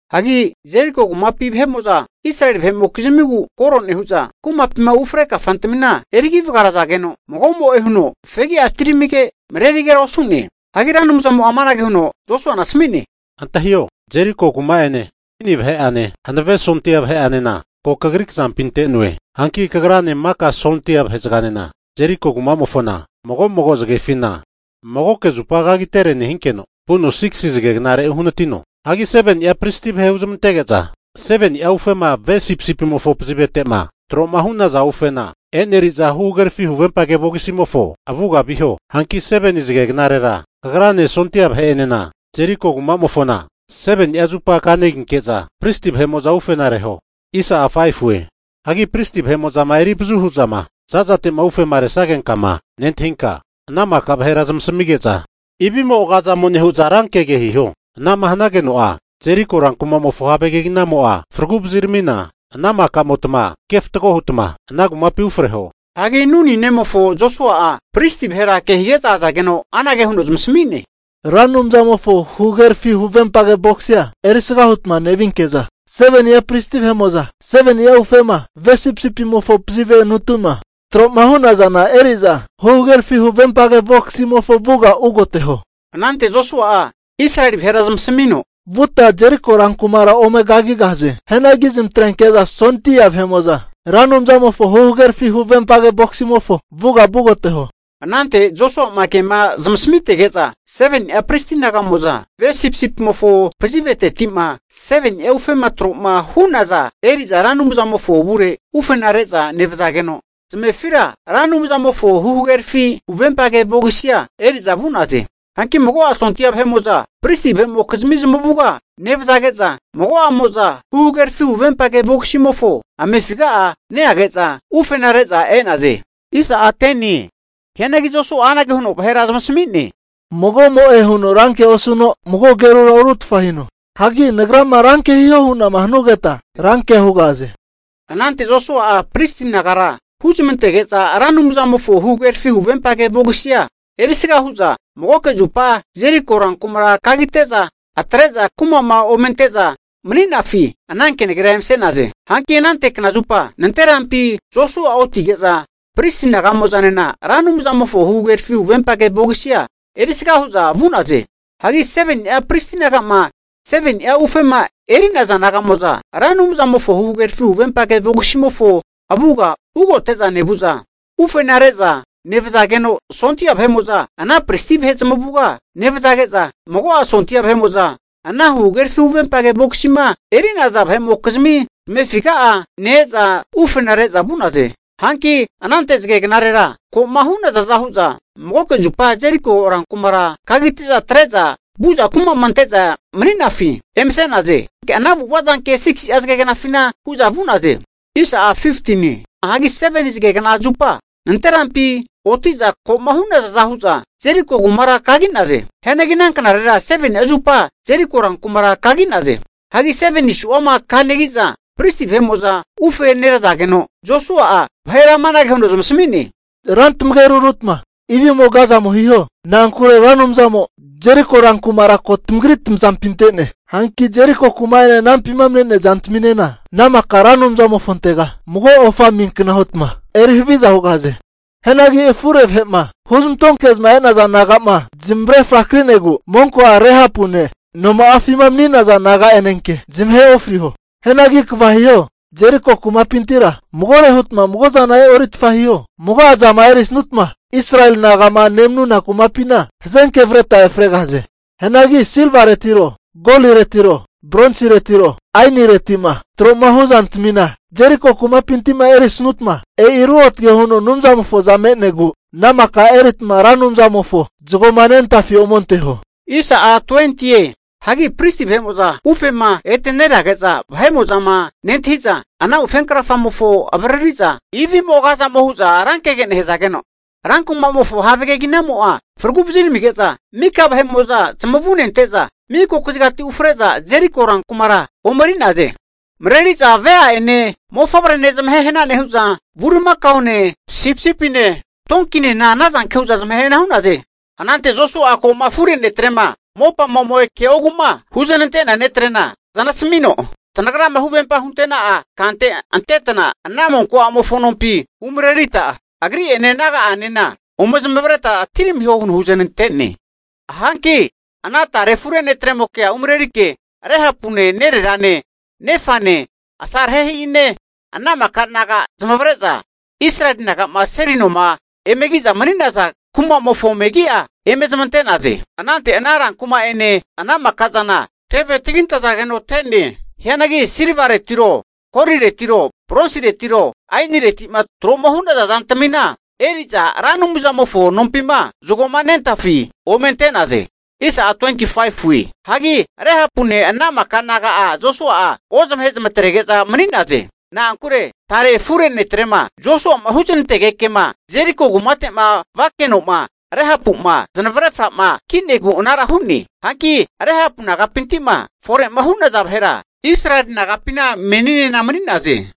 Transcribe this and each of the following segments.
Hagi Jeriko kumapi vahe'mo'za Israeli vahe'mokizmigu koro nehu'za kumapima ufre kafantamina erigi vagarazageno, mago'mo'e huno fegira atiramige, marerigera osu'ne. Hagi Ra Anumzamo'a amanage huno Josuana asami'ne, Antahio! Jeriko kuma'ene, kini vahe'ane, hanave sondia vahe'anena ko kagri kazampi ante'noe. Hanki kagrane maka sondia vahe'zaganena, Jeriko kumamofona mago mago zagefina magoke zupa kagitere nehinkeno, vuno 6si zage knare uhanatino. Hagi 7ni'a pristi vahe huzamantege'za 7ni'a ufema ve sipisipimofo pazivete'ma tro'ma hu'naza ufena e'neri'za huhagerafi huvempage vogisimofo avuga viho. Hanki 7ni zage knarera kagrane sondia vahe'enena Jeriko kumamofona 7ni'a zupa kaneginke'za pristi vahe'mo'za ufena reho. Hagi pristi vahe'mo'zama erivazu hu'zama zazate'ma ufema resagenkama nentahinka, ana maka vahera zamasamige'za ivimo agazamo nehu'za rankegege hiho. Anama hanageno'a, Jeriko rankumamofo have keginamo'a fragu vaziramina, ana makamotma kefatgo hutma ana kumapina ufreho. Hagi Nuni nemofo Josua'a pristi vahera kehige'za azageno anage huno zamasami'ne, Ra Anumzamofo huhagerafi huvempage vogisia erisga hutma nevinke'za, 7ni'a pristi vahe'mo'za 7ni'a ufema ve sipisipimofo pazivenuti'ma tro'ma hu'nazana eri'za, huhagerafi huvempage vogisimofo avuga vugoteho. Anante Josua'a Israeli vahera zamasamino, Vuta Jeriko rankumara ome kagigahaze. Hianagi zamatrenke'za sondia vahe'mo'za Ra Anumzamofo huhagerafi huvempage vogisimofo avuga vugoteho. Anante Josua'ma kema zamasamitege'za, 7ni'a pristi naga'mo'za ve sipisipimofo paziveteti'ma 7ni'a ufema tro'ma hu'naza eri'za Ra Anumzamofo avure ufena re'za nevazageno, zamefira Ra Anumzamofo huhagerafi huvempage vogisia eri'za vu'naze. Hanki mago'a sondia vahe'mo'za pristi vahe'mokizmi zamavuga nevzage'za, mago'amo'za huhagerafi huvempage vogisimofo amefiga'a neage'za, ufena re'za e'naze. Hianagi Josua'a anage huno vahera zamasami'ne, Mago'mo'e huno rankea osuno, mago agerura orutfa hino. Hagi nagrama ranke hihoma hu'nama hanugeta, rankea hugahaze. Anante Josua'a pristi nagara huzamantege'za Ra Anumzamofo huhagerafi huvempage vogisia erisga hu'za, magoke zupa Jeriko rankumara kagite'za, atre'za kuma'ma omente'za mani'nafi ana kenagera emase'naze. Hanki anante knazupa nanterampi Josua'a otige'za, pristi naga'moza'nena Ra Anumzamofo huhagerafi huvempage vogisia erisga hu'za vu'naze. Hagi 7ni'a pristi naga'ma 7ni'a ufema eri'naza naga'mo'za Ra Anumzamofo huhagerafi huvempage vogisimofo avuga ugote'za nevu'za, ufenare'za nevazageno, sondia vahe'mo'za ana pristi vahe zamavuga nevzage'za, mago'a sondia vahe'mo'za ana huhagerafi huvempage vogisima eri'zana vahe'mokizmi zamefiga'a ne-eza ufenare'za vu'naze. Hanki anante zage knarera ko'ma hu'nazaza hu'za, magoke zupa Jeriko rankumara kagite'za atre'za vu'za kuma'ma emente'za mani'nafi emase'naze. Ana avu'ava zanke 6'a zage knafina hu'za vu'naze. Hanki 7ni zagekna zupa nanterampi oti'za ko'ma hu'nazaza hu'za Jeriko kumara kagi'naze. Hianagi ana knarera 7ni'a zupa Jeriko ran kumara kagi'naze. Hagi 7nire'ma kamanegi'za, pristi vahe'mo'za ufe nerazageno Josua'a vahera amanage huno zamasami'ne, ra tamageru rutma ivimo agazamo hiho. Na'ankure Ra Anumzamo Jeriko rankumara ko tamagri tamazampi ante'ne. Hanki Jeriko kuma'ene anampima me'nea zantamia ana maka Ra Anumzamofontega mago ofa amiankna hutma eri haviza hugahaze. Hianagi afure vahe'ma huzmantoke'zama e'naza naga'ma zamavare frakinegu monko a' Rehapune noma'afima mani'naza naga'anenke zamahe ofriho. Hianagi kva hiho, Jeriko kumapintira magore hutma mago'zana e'oritfa hiho. Mago'zama erisutma Israeli naga'ma nemanuna kumapina hazenke avreta efregahaze. Hianagi silvaretiro, goliretiro, bronsiretiro aenireti'ma tro'mahu zantamima Jeriko kumapinti'ma erisutma, e'i ruotage huno Anumzamofoza me'negu, ana maka eritma Ra Anumzamofo zagoma nentafi omenteho. Hanki pristi vahe'mo'za ufema ete nerage'za vahe'mo'zama nentahi'za, ana ufenkrafamofo avariri'za ivimo agazamo huza rankege nehazageno, rankumamofo have keginamo'a fragu vaziramige'za, maka vahe'mo'za zamavune ante'za miko kazigati ufre'za Jeriko rankumara ome eri'naze. Mareri'za vea'ene mofavrene zamahehana nehu'za bulimakaone, sipisipine, tonkinena, anazanke hu'za zamahehana hu'naze. Anante Josua'a ko'ma afure netrema mopama ome ke'ogu'ma huzanante'nea netre'na zanasamino, tanagrama huvempa huntena'a kante antetna, ana monko a'mofo nompi umarerita agri'ene naga'anena ome zamavareta atiramiho huno huznantene. Hanki ana tare afure ne'tremokea umarerike Rehapune nererane nefane, asarehe'ine ana maka naga'a zamavare'za Israeli naga'ma seli noma emegi'za mani'naza kumamofo megi'a eme zamante'naze. Anante ana ran kuma'ene ana maka'zana teve tagintazageno te'ne. Hianagi silvaretiro goliretiro bronsiretiro aenireti'ma tro'ma hu'naza zantamina eri'za Ra Anumzamofo nompima zagoma nentafi ome ante'naze. Hagi Rehapune ana maka naga'a Josua'a ozmahe zamatrege'za mani'naze. Na'ankure tare afure netrema Josua'ma huznantegekema Jeriko kumate'ma vakeno'ma Rehapu'ma zanavre fra'ma ki'negu anara hu'ne. Hanki Rehapu nagapinti'ma fore'ma hu'naza vahera Israeli nagapine meninena mani'naze.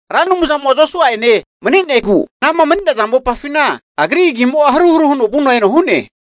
Ra Anumzamo'a Josua e'ne mani'negu agri agimo'a anama mani'naza mopafina haruharu huno vuno eno hu'ne.